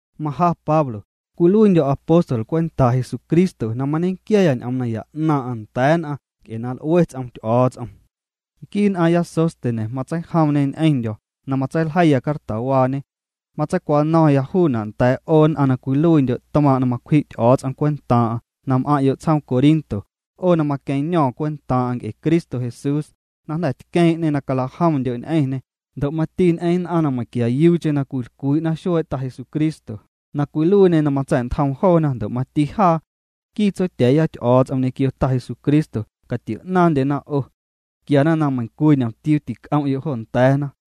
Maja Pablo, cwiluiindyo̱ apóstol cwentaa' Jesucristo na mañequiaya ñ'oom naya 'naaⁿ'aⁿ nda̱a̱ nn'aⁿ nc'e na l'ue ts'om Ty'o̱o̱ts'om. Nquii nn'aaⁿya Sóstenes matseijomñê ñ'eⁿndyo̱ na matseiljeiya cartawaañe. Matseicwano̱ⁿya juuna' nda̱a̱' 'o nn'aⁿ na cwiluiindyo' tmaaⁿ' na macwji' Ty'o̱o̱ts'om cwentaaⁿ'aⁿ na m'aⁿ'yo' tsjoom Corinto, 'o na maqueⁿño̱o̱ⁿ cwentaaⁿ'aⁿ nc'e Cristo Jesús, na jnda̱ tqueeⁿ'ñê na calajomndyo' ñ'eⁿñê, ndo' mati ñ'eⁿ nn'aⁿ meiⁿquiayuucheⁿ na cwilcwii'na xuee' Ta Jesucristo, na cwiluiiñê na matsa̱'ntjoom joona ndo' mati jaa. Nquii Tsotya̱a̱ya Ty'o̱o̱ts'om ñequio Ta Jesucristo catio'naaⁿndyena 'o. Quiana na meiⁿcwii ñomtiuu tic'om'yo' jo nda̱a̱na.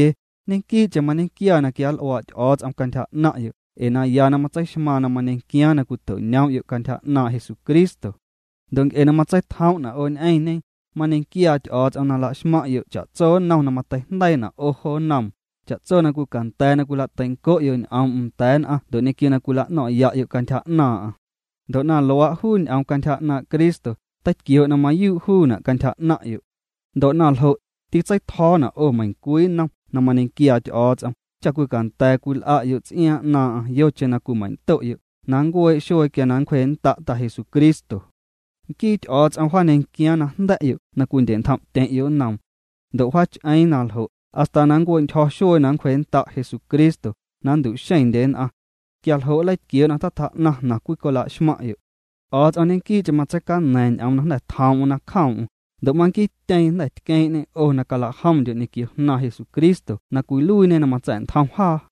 Ñequii'cheⁿ mañequia na quianl'uaa' Ty'o̱o̱ts'om cantyja 'naⁿ'yo' ee naya na matseixmaaⁿ na mañequiaaⁿ na cwito'ñoom'yo' cantyja 'naaⁿ' Jesucristo. Ndo' nc'e na matseitjoom'na' 'o ñ'eⁿñe, mañequiaa Ty'o̱o̱ts'om na la'xmaⁿ'yo' cha'tso nnom na mateijndeiina' 'o jo nnoom, cha'tso na cwicanda̱a̱ na cwila'teinco'yo' ñ'oom'm nda̱a̱ nn'aⁿ ndo' ñequio na cwila'no̱ⁿ'ya'yo' cantyja 'naaⁿ'aⁿ. Ndo' na luaa', juu ñ'oom cantyja 'naaⁿ' Cristo teitquioo' na mayuu' juuna' cantyja 'naⁿ'yo'. Ndo' na ljo', titseitjo̱o̱na' 'o meiⁿcwii nnom na mañequiaa Ty'o̱o̱ts'om cha cwicanda̱a̱ cwil'a'yo' ts'iaaⁿ 'naaⁿ'aⁿ yocheⁿ na cwimeiⁿndo'yo' na nncuee' xuee quia na nncwjee'nnda' Ta Jesucristo. Nquii Ty'o̱o̱ts'om wjaañequiaaⁿ najnda̱'yo' na cwindye'ntjom'tyeⁿ'yo' nnoom. Ndo' wjaach'eeⁿ na ljo' hasta na nncue'ntyjo̱ xuee na nncwjee'nnda' Jesucristo na nntu'xeⁿndye nn'aⁿ. Quia jo' nleitquioo' na tatjaa'naⁿ jnaⁿ cwicwila'xmaⁿ'yo'. Ty'o̱o̱ts'om ñequii'cheⁿ matseicaña̱a̱ⁿ ñ'oom na jnda̱ tjoom'm na cjoom'm, ndo' manquiityeeⁿ jnda̱ tqueeⁿ'ñê 'o na calajomndyo' ñequio Jnaaⁿ Jesucristo na cwiluiiñe na matsa̱'ntjom jaa.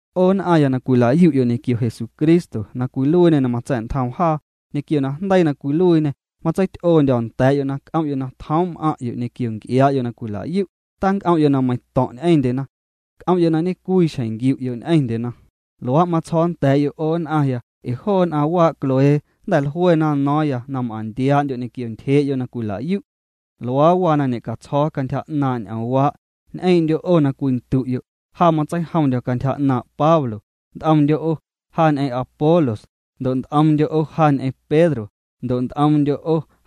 'O nn'aⁿya na cwila'yu'yo' ñequio Jesucristo na cwiluiiñê na matsa̱'ntjoom jaa, ñequio najndeii na cwiluiiñê matseity'oondyo̱ nda̱a̱'yo' na c'om'yo' na tjoom' m'aⁿ'yo' ñequio nc'iaa'yo' na cwila'yu', tanc'om'yo' na meiⁿto̱ⁿ' ñ'eⁿndyena. C'om'yo' na ñecwiixjeⁿ nquiu'yo' ñ'eⁿndyena. Luaa' matsjo̱o̱ nda̱a̱'yo' 'o nn'aⁿya ee joo nn'aⁿ waa' Cloé jnda̱ jluena no̱o̱ⁿya na m'aⁿntiaa'ndyo' ñequio ntyjee'yo' na cwilayu'. Luaa waa na ñe'catsjo̱o̱ cantyja 'naaⁿ' ñ'oomwaa', ñ'eeⁿ'ndyo' 'o na cwindu'yo': “Ja matseijomndyo̱ cantyja 'naaⁿ' Pablo”; nt'omndyo' 'o: “Ja ñ'eⁿ Apolos”; ndo' nt'omndyo': “Ja ñ'eⁿ Pedro”; ndo' nt'omndyo':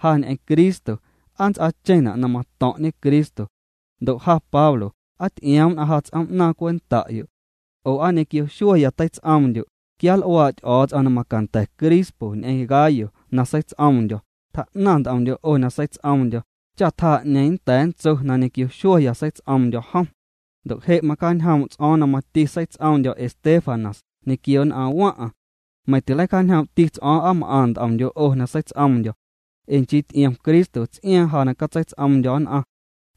“Ja ñ'eⁿ Cristo”. ¿Aa nts'aacheⁿna' na mato̱ⁿ'ñe Cristo? Ndo' ja Pablo, ¿aa ty'ioom nn'aⁿ ja ts'oom'naaⁿ cwenta'yo'? Oo, ¿aa ñequio xueeya teits'oomndyo'? Quianl'uaa' Ty'o̱o̱ts'om na macanda̱ Crispo ñ'eⁿ Gayo na seits'oomndyo̱, tjaa'naⁿ nt'omndyo' 'o na seits'oomndyo̱, cha tjaa 'ñeeⁿ nnda̱a̱ nntso na ñequio xueeya seits'oomndyo̱ jom. Ndo' je' macjaañjoom' ts'o̱o̱ⁿ na mati seits'oomndyo̱ Estéfanas ñequio nn'aⁿ waⁿ'aⁿ. Meiⁿ tileicjaañjoom'ti ts'o̱o̱ⁿ aa m'aⁿ nt'omndyo' 'o na seits'oomndyo̱. Ee nchii ty'iom Cristo ts'iaaⁿ ja na catseits'oomndyo̱ nn'aⁿ.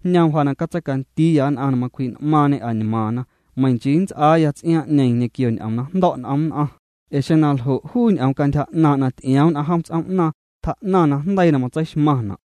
Jñoom ja na catseicandiiya nn'aⁿ na macwji'n'maaⁿñê añmaaⁿna, meiⁿ nchii nts'aaya ts'iaaⁿ'ñeeⁿ ñequio ñ'oom na jndo̱' n'om nn'aⁿ, ee xeⁿ naljo', juu ñ'oom cantyja 'naaⁿ' na ty'ioom nn'aⁿ jom ts'oom'naaⁿ, tjaa'naⁿ najndeii na matseixmaⁿna'.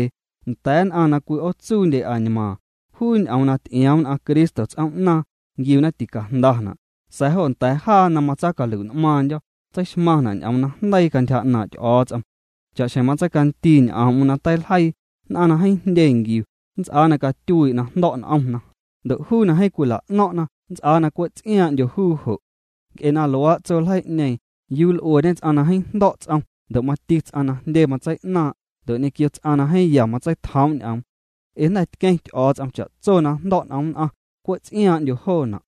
Nda̱a̱ nn'aⁿ na cwi'ootsuundye añmaaⁿ, juu ñ'oom na ty'ioom nn'aⁿ Cristo ts'oom'naaⁿ, nquiuna ticajndana', sa̱a̱ jo nda̱a̱ jaa na matsaacalui'n'maaⁿndyo̱, tseixmaⁿna' ñ'oom najndeii cantyja 'naaⁿ' Ty'o̱o̱ts'om. Cha'xjeⁿ matseicandii ñ'oom'm na teiljeii: Nn'aⁿ na jeeⁿ jndye nquiu, nnts'aa na catyuii' na jndo̱' n'omna, ndo' juu na jeeⁿ cwila'no̱ⁿ'na, nnts'aa na cwe' ts'iaaⁿ'ndyo juu jo'. Nc'e luaa' tso ljeii'ñeeⁿ, ¿yuu l'ueñe ts'aⁿ na jeeⁿ jndo̱' ts'om ndo' mati ts'aⁿ na jndye matsei'naaⁿ' ndo' ñequio ts'aⁿ na jeeⁿ ya matseitjoom' ñ'oom? Ee jnda̱ tqueⁿ Ty'o̱o̱ts'om cha'tso na jndo̱' n'om nn'aⁿ, cwe' ts'iaaⁿ'ndyo joona'.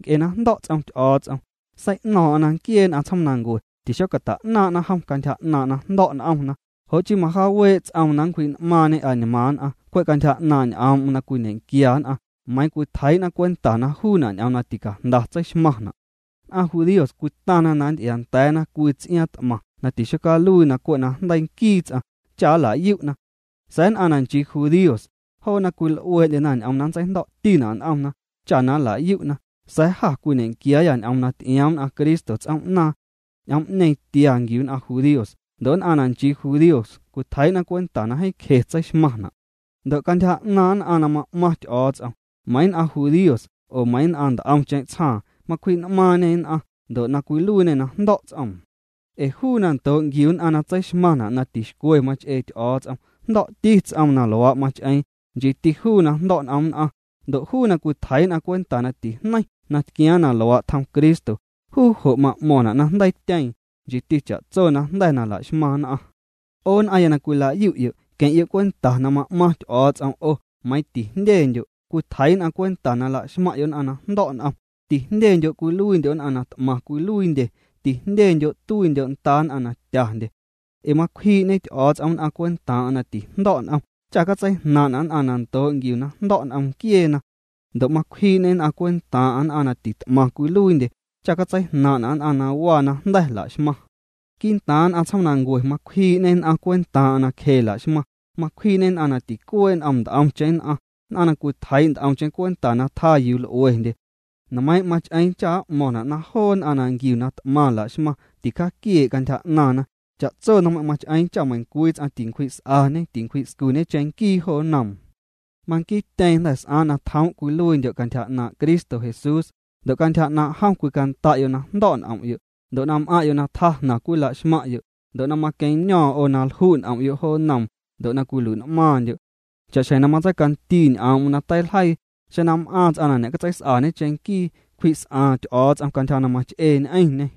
Nc'e na jndo̱' ts'om Ty'o̱o̱ts'om, sei'no̱o̱ⁿ'o̱ⁿ na nquiee nn'aⁿ tsjoomnancue tixocata'jnaaⁿ'na jom cantyja 'naaⁿ' na jndo̱' n'omna, jo' chii majaawee' ts'oom na nncwji'n'maaⁿñê añmaaⁿ nn'aⁿ cwe' cantyja 'naaⁿ' ñ'oom'm na cwiñequia nn'aⁿ, meiiⁿ cwitjeii'na cwenta na juuna' ñ'oom na ticajnda tseixmaⁿna'. Nn'aⁿ judíos cwitaⁿna na nnty'iaanda̱a̱na cwii ts'iaaⁿ t'maⁿ na tixocaluiina' na cwe' najndeii nquii ts'aⁿ cha nla'yu'na. Sa̱a̱ nn'aⁿ na nchii judíos, joona cwil'uee'ndyena ñ'oom na nntseijndo̱'tina' n'omna cha na nla'yu'na, sa̱a̱ jâ cwiñequiaayâ ñ'oom na ty'ioom nn'aⁿ Cristo ts'oom'naaⁿ. Ñ'oom'ñeeⁿ tia nquiu nn'aⁿ judíos ndo' nn'aⁿ na nchii judíos cwitjeii'na cwenta na jeeⁿ cje tseixmaⁿna'. Ndo' cantyja 'naaⁿ nn'aⁿ na ma'maⁿ Ty'o̱o̱ts'om, meiiⁿ nn'aⁿ judíos oo meiiⁿ nn'aⁿ nt'omcheⁿ tsjaaⁿ, macwji'n'maaⁿñê nn'aⁿ, ndo' na cwiluiiñe na jndo̱' ts'oom. Ee juu na ndoo' nquiu nn'aⁿ na tseixmaⁿna' na tixcwe mach'ee Ty'o̱o̱ts'om jndo̱'ti ts'oom na luaa' mach'eeⁿ, nchiiti juu na jndo̱' n'om nn'aⁿ, ndo' juu na cwitjeii'na cwenta na tijneiⁿ na tquiaaⁿ na luaa' tjom Cristo, juu jo' ma'mo̱ⁿna' na jndeiityeeⁿ, nchiiti cha'tso najnda̱ na la'xmaⁿ nn'aⁿ. 'O nn'aⁿya na cwila'yu'yo', queⁿ'yo' cwenta na ma'maⁿ Ty'o̱o̱ts'om 'o meiⁿ tijndyendyo' cwitjeii' nn'aⁿ cwenta na la'xmaⁿ'yo' nn'aⁿ na jndo̱' n'om, tijndyendyo' cwiluiindyo' nn'aⁿ na t'maⁿ cwiluiindye, tijndyendyo' tuiindyo' nda nn'aⁿ na tyandye. Ee macwjii'ñe Ty'o̱o̱ts'om nn'aⁿ cwentaaⁿ'aⁿ na tijndo̱' n'om cha catseijnaaⁿ'na' nn'aⁿ na ndoo' nquiuna na jndo̱' n'om nquieena. Ndo' macwjii'ñê cwentaaⁿ'aⁿ nn'aⁿ na tit'maⁿ cwiluiindye cha cantseijnaaⁿ'na' nn'aⁿ na waa na jnda̱ la'xmaⁿ. Quii'ntaaⁿ nn'aⁿ tsjoomnancue macwjii'ñê nn'aⁿ cwentaaⁿ'aⁿ na cje la'xmaⁿ, macwjii'ñê nn'aⁿ na ticuee' n'om nt'omcheⁿ nn'aⁿ, nn'aⁿ na cwitjeii' nt'omcheⁿ cwenta na tjaa yuu l'uendye. Nmeiiⁿ' mach'eeⁿ cha' m'mo̱ⁿna' na joo nn'aⁿ na nquiu na t'maⁿ la'xmaⁿ ticjaaquiee' cantyja 'naaⁿna. Cha'tso nmeiⁿ' mach'eeⁿ cha meiⁿcwii ts'aⁿ tincwji's'añe tincwji'scuñe cheⁿnquii jo nnoom. Manquiityeeⁿ jnda̱ s'aaⁿ na tjoom' cwiluiindyo' cantyja 'naaⁿ' Cristo Jesús, ndo' cantyja 'naaⁿ' jom cwicanda'yo' na jndo̱' n'om'yo', ndo' na m'aⁿ'yo' na tjaa jnaⁿ cwila'xmaⁿ'yo', ndo' na maqueⁿño̱o̱ⁿ 'o na lju' n'om'yo' jo nnoom, ndo' na cwilui'n'maaⁿndyo'. Cha'xjeⁿ na matseicandii ñ'oom'm na teiljeii: “Xeⁿ na m'aaⁿ ts'aⁿ na ñe'catseis'aañe cheⁿnquii, cwji's'aaⁿ Ty'o̱o̱ts'om cantyja na mach'ee ñ'eⁿñê.”